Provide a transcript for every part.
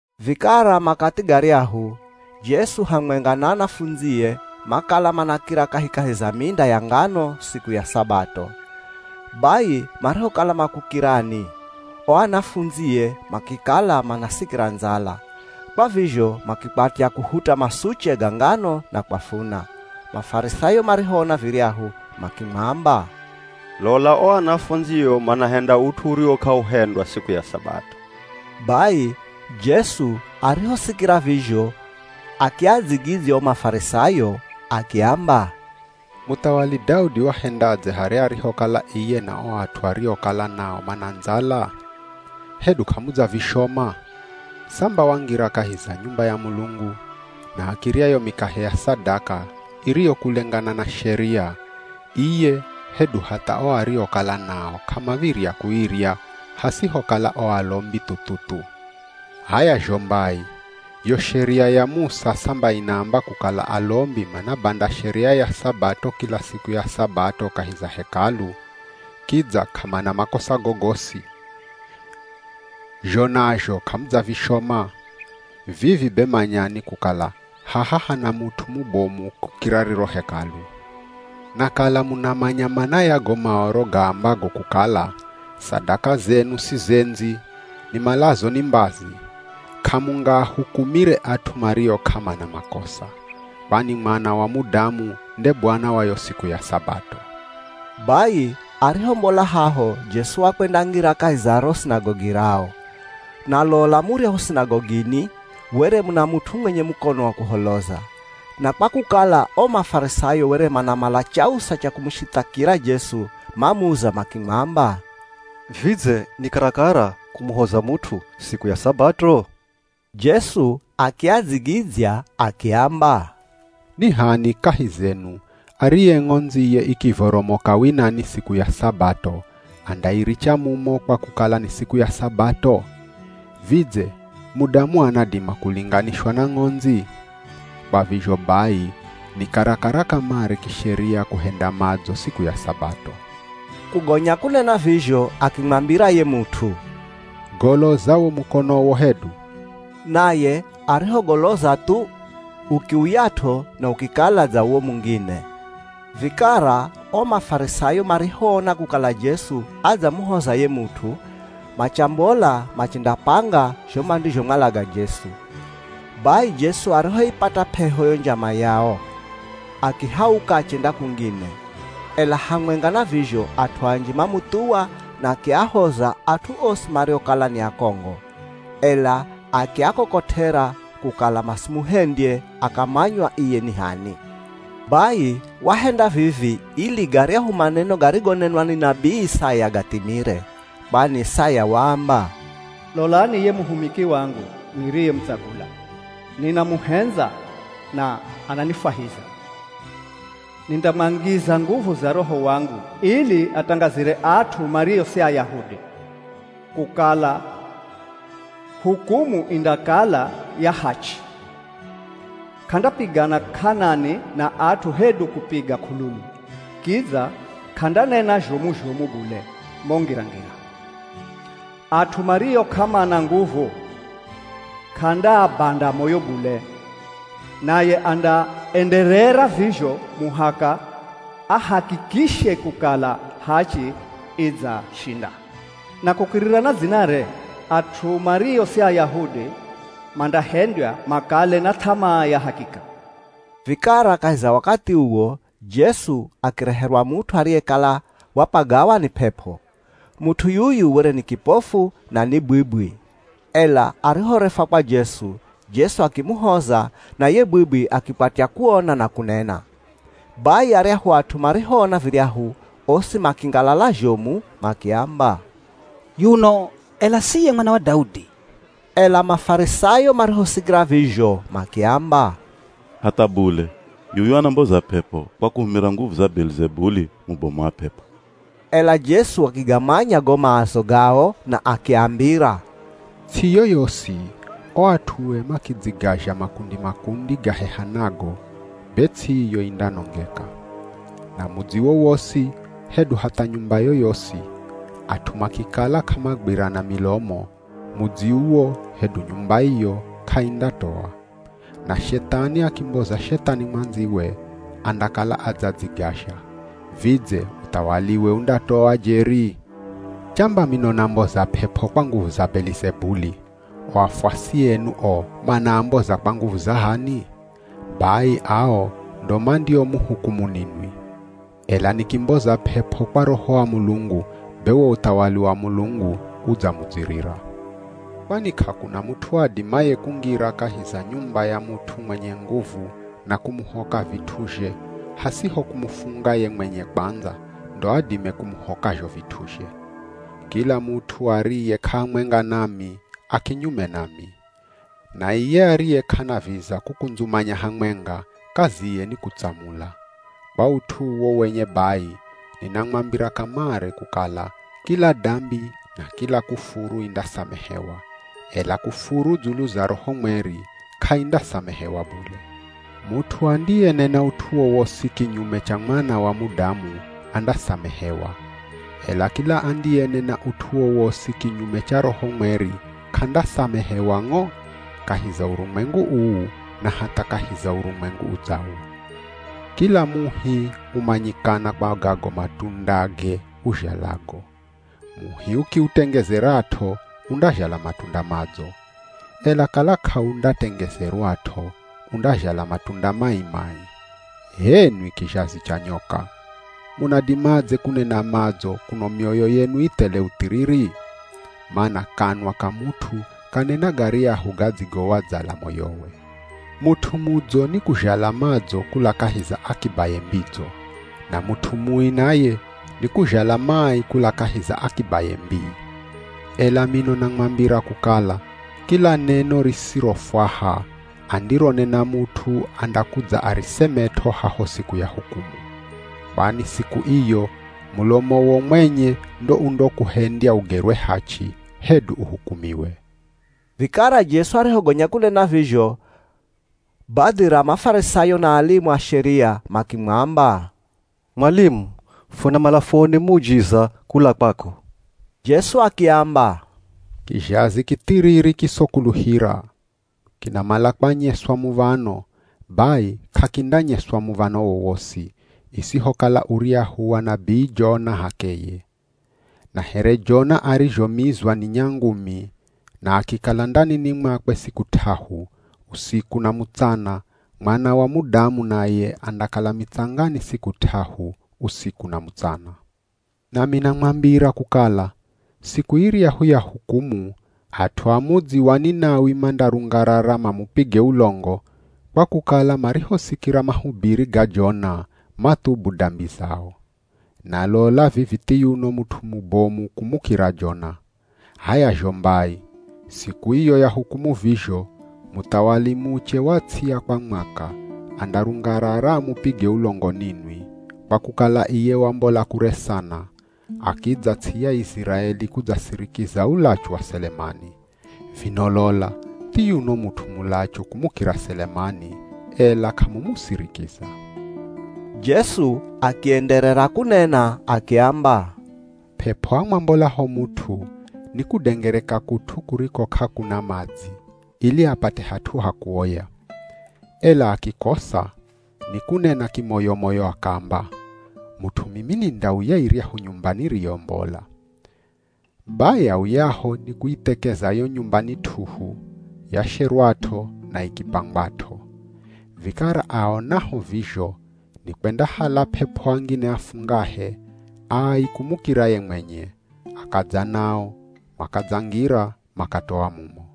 Vikara makathi garyahu, Jesu hamwenga na anafundzie makala manakira kahikahi za minda ya ngano siku ya Sabato. Bai marihokala makukirani, o anafundzie makikala manasikira ndzala, kwa vizho makikwatya kuhuta masuche ga ngano na kwafuna. Mafarisayo marihoona viryahu makimwamba, “Lola! O anafundzio manahenda ut'u uriwo k'auhendwa siku ya Sabato.” Bai Jesu arihosikira vizho akiadzigidzya o Mafarisayo akiamba, “Muthawali Daudi wahendadze harya arihokala iye na o at'u ariokala nao mana ndzala? Hedu k'amudzavishoma? Samba wangira kahi za nyumba ya Mulungu, na akirya yo mikahe ya sadaka, iriyo kulengana na Sheria, iye hedu hatha ao ariokala nao k'amav̱irya kuirya, hasihokala o alombi thu-thu-thu. H'aya zho mbai, yo Sheria ya Musa samba inaamba kukala alombi manabanda Sheria ya Sabato kila siku ya Sabato kahi za Hekalu, kidza k'amana makosa gogosi. Zho nazho k'amudzavishoma? Vivi be manyani kukala haha hana mut'u mubomu kukira riro Hekalu. Na kala munamanya mana ya go Maoro gaambago kukala, ‘Sadaka zenu sizendzi, nimalazo ni mbazi,’ k'amungaahukumire at'u mario k'amana makosa. Kwani Mwana wa Mudamu nde Bwana wa yo siku ya Sabato.” Bai arihombola haho Jesu wakwendangira kahi za ro sinagogi rao. Na lola muryahu sinagogini, were muna mut'u mwenye mukono wa kuholoza. Na kwa kukala o Mafarisayo were manamala chausa cha kumushithakira Jesu, mamuza makimwamba, “Vidze, ni karakara kumuhoza mut'u siku ya Sabato?” Jesu akiadzigidzya akiamba, “Ni h'ani kahi zenu ariye ng'ondziye ikivoromoka winani siku ya Sabato andairicha mumo kwa kukala ni siku ya Sabato? Vidze mudamu anadima kulinganishwa na ng'ondzi? Kwa vizho bai ni karakara kamare kisheria kuhenda madzo siku ya Sabato.” Kugonya kunena vizho, akimwambira ye mut'u, “Goloza wo mukonowo hedu.” Naye arihogoloza thu, ukiuyat'o na ukikala dza uwo mungine. Vikara o Mafarisayo marihoona kukala Jesu adzamuhoza ye mut'u, machambola machendapanga zho mandizhomwalaga Jesu. Bai Jesu arihoipata p'eho yo njama yao, akihauka achenda kungine. Ela hamwenga na vizho, at'u anji mamuthuwa na akiahoza at'u osi mariokala ni akongo. Ela akiakokot'era kukala masimuhendye akamanywa iye ni h'ani. Bai wahenda vivi ili garyahu maneno garigonenwa ni nabii Isaya gathimire. Kwani Isaya waamba, “Lolani ye muhumiki wangu niriyemutsagula. Ninamuhendza na ananifwahiza. Nindamwangiza nguvu za Roho wangu ili atangazire at'u mario si Ayahudi, kukala hukumu indakala ya hachi. K'andapigana k'anani na at'u hedu kupiga k'ululu. Kidza k'andanena zhomu-zhomu bule mo ngira-ngira. At'u mario k'amana nguvu k'andaabanda moyo bule. Naye andaenderera vizho muhaka ahakikishe kukala hachi idzashinda. Na kukirira na dzinare, at'u mario si Ayahudi mandahendywa makale na th'amaa ya hakika.” Vikara kahi za wakathi uwo, Jesu akireherwa mut'u ariyekala wapagawa ni p'ep'o. Mut'u yuyu were ni kipofu, na ni bwibwi. Ela arihorefwa kwa Jesu, Jesu akimuhoza na ye bwibwi akikwatya kuona na kunena. Bai aryahu at'u marihoona viryahu osi makingalala zhomu, makiamba, “Yuno ela si iye Mwana wa Daudi?” Ela Mafarisayo marihosikira vizho makiamba, “Hatha bule! Yuyu anamboza p'ep'o kwa kuhumira nguvu za Belizebuli, mubomu wa p'ep'o.” Ela Jesu akigamanya go maazo gao na akiambira, “Ts'i yoyosi, o at'ue makidzigazha makundi-makundi, gahehanago, be ts'i iyo indanongeka. Na mudzi wowosi hedu hatha nyumba yoyosi, at'u makikala k'amagwirana milomo, mudzi uwo hedu nyumba iyo, k'aindatoa. Na Shethani akimboza Shethani mwandziwe, andakala adzadzigazha. Vidze uthawaliwe undatoa jeri? Chamba mino namboza p'ep'o kwa nguvu za Belizebuli, o afuasi enu o manaamboza kwa nguvu za h'ani? Bai ao ndo mandiomuhukumu ninwi. Ela nikimboza p'ep'o kwa Roho wa Mulungu, be wo uthawali wa Mulungu udzamudzirira. Kwani k'akuna mut'u adimaye kungira kahi za nyumba ya mut'u mwenye nguvu na kumuhoka vit'uzhe hasiho kumufunga ye mwenye kwandza, ndo adime kumuhoka zho vit'uzhe.” “Kila mut'u ariye k'ahamwenga nami, a kinyume nami. Na iye ariye k'anaviza kukundzumanya hamwenga, kaziye ni kutsamula. Kwa ut'u uwo wenye bai, ninamwambira kamare kukala, kila dambi na kila kufuru indasamehewa, ela kufuru dzulu za Roho Mweri, k'aindasamehewa bule. Mut'u andiyenena ut'u wowosi kinyume cha Mwana wa Mudamu andasamehewa. Ela kila andiyenena ut'u wowosi kinyume cha Roho Mweri k'andasamehewa ng'o, kahi za urumwengu uu, na hatha kahi za urumwengu udzawo.” “Kila muhi umanyikana kwa gago matundage uzhalago. Muhi ukiutengezerat'o undazhala matunda madzo. Ela kala k'aundatengezerwat'o undazhala matunda mai-mai. H'enwi kizhazi cha nyoka! Munadimadze kunena madzo kuno mioyo yenu i thele uthiriri? Mana kanwa ka mut'u kanena garyahu gadzigowadzala moyowe. Mut'u mudzo, nikuzhala madzo kula kahi za akibaye mbidzo. Na mut'u mui naye, nikuzhala mai, kula kahi za akibaye mbii. Ela mino namwambira kukala, kila neno risirofwaha, andironena mut'u andakudza arisemet'o haho siku ya hukumu. Kwani siku iyo, mulomowo mwenye ndo undokuhendya ugerwe hachi, hedu uhukumiwe.” Vikara Jesu arihogonya kunena vizho, badhi ra Mafarisayo na alimu a Sheria makimwamba, “Mwalimu, funamala fuone muujiza kula kwako.” Jesu akiamba, “Kizhazi kithiriri kisokuluhira! Kinamala kwanyeswa muv̱ano, bai k'akindanyeswa muv̱ano wowosi, isihokala uryahu wa nabii Jona h'akeye. Na here Jona arizhomizwa ni nyangumi, na akikala ndanini mwakwe siku t'ahu, usiku na mutsana, Mwana wa Mudamu naye andakala mitsangani siku t'ahu, usiku na mutsana. Nami namwambira kukala, siku iryahu ya hukumu at'u a mudzi wa Ninawi mandarungarara mamupige ulongo, kwa kukala marihosikira mahubiri ga Jona, mathubu dambi zao. Na lola vivi thiyuno mut'u mubomu kumukira Jona. H'aya zho mbai, siku iyo ya hukumu vizho, muthawali muche wa ts'i ya kwa Mwaka, andarungarara amupige ulongo ninwi, kwa kukala iye wambola kure sana, akidza ts'i ya Iziraeli kudzasirikiza ulachu wa Selemani. Vino lola thiyuno mut'u mulachu kumukira Selemani, ela k'amumusirikiza.” Jesu akienderera kunena akiamba, “P'ep'o amwambolaho mut'u, nikundengereka kut'u kuriko k'akuna madzi ili apate hat'u ha kuoya, ela akikosa, nikunena kimoyo-moyo akaamba, ‘Mut'u mimi nindauya iryahu nyumba niriyombola.’ Bai auyaho nikuithekeza yo nyumba ni t'uhu, yasherwat'o na ikipangwat'o. Vikara aonaho vizho nikwendahala p'ep'o angine afungahe, ai kumukira ye mwenye, akadza nao, makadzangira, makatoa mumo.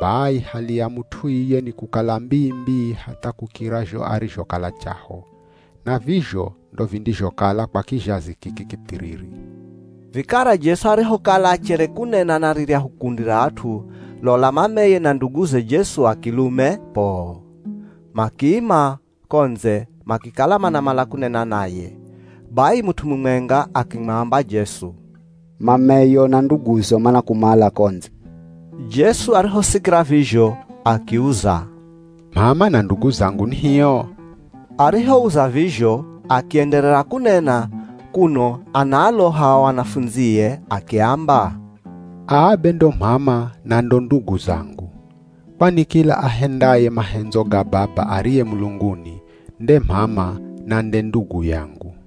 Bai hali ya mut'u iye ni kukala mbii-mbii hatha kukira zho arizhokala chaho. Na vizho ndo vindizhokala kwa kizhazi kiki kithiriri.” Vikara Jesu arihokala achere kunena na riryahu kundi ra at'u, lola mameye, na nduguze Jesu a kilume poo! Makiima ko ndze, makikala manamala kunena naye. Bai mut'u mumwenga akimwamba Jesu, “Mameyo na nduguzo manakumala ko ndze.” Jesu arihosikira vizho akiuza, “M'ama na ndugu zangu ni hio?” Arihouza vizho, akienderera kunena kuno anaaloha o anafundzie akiamba, “Aa be ndo m'ama na ndo ndugu zangu. Kwani kila ahendaye mahendzo ga Baba ariye mulunguni, nde m'ama na nde ndugu yangu.”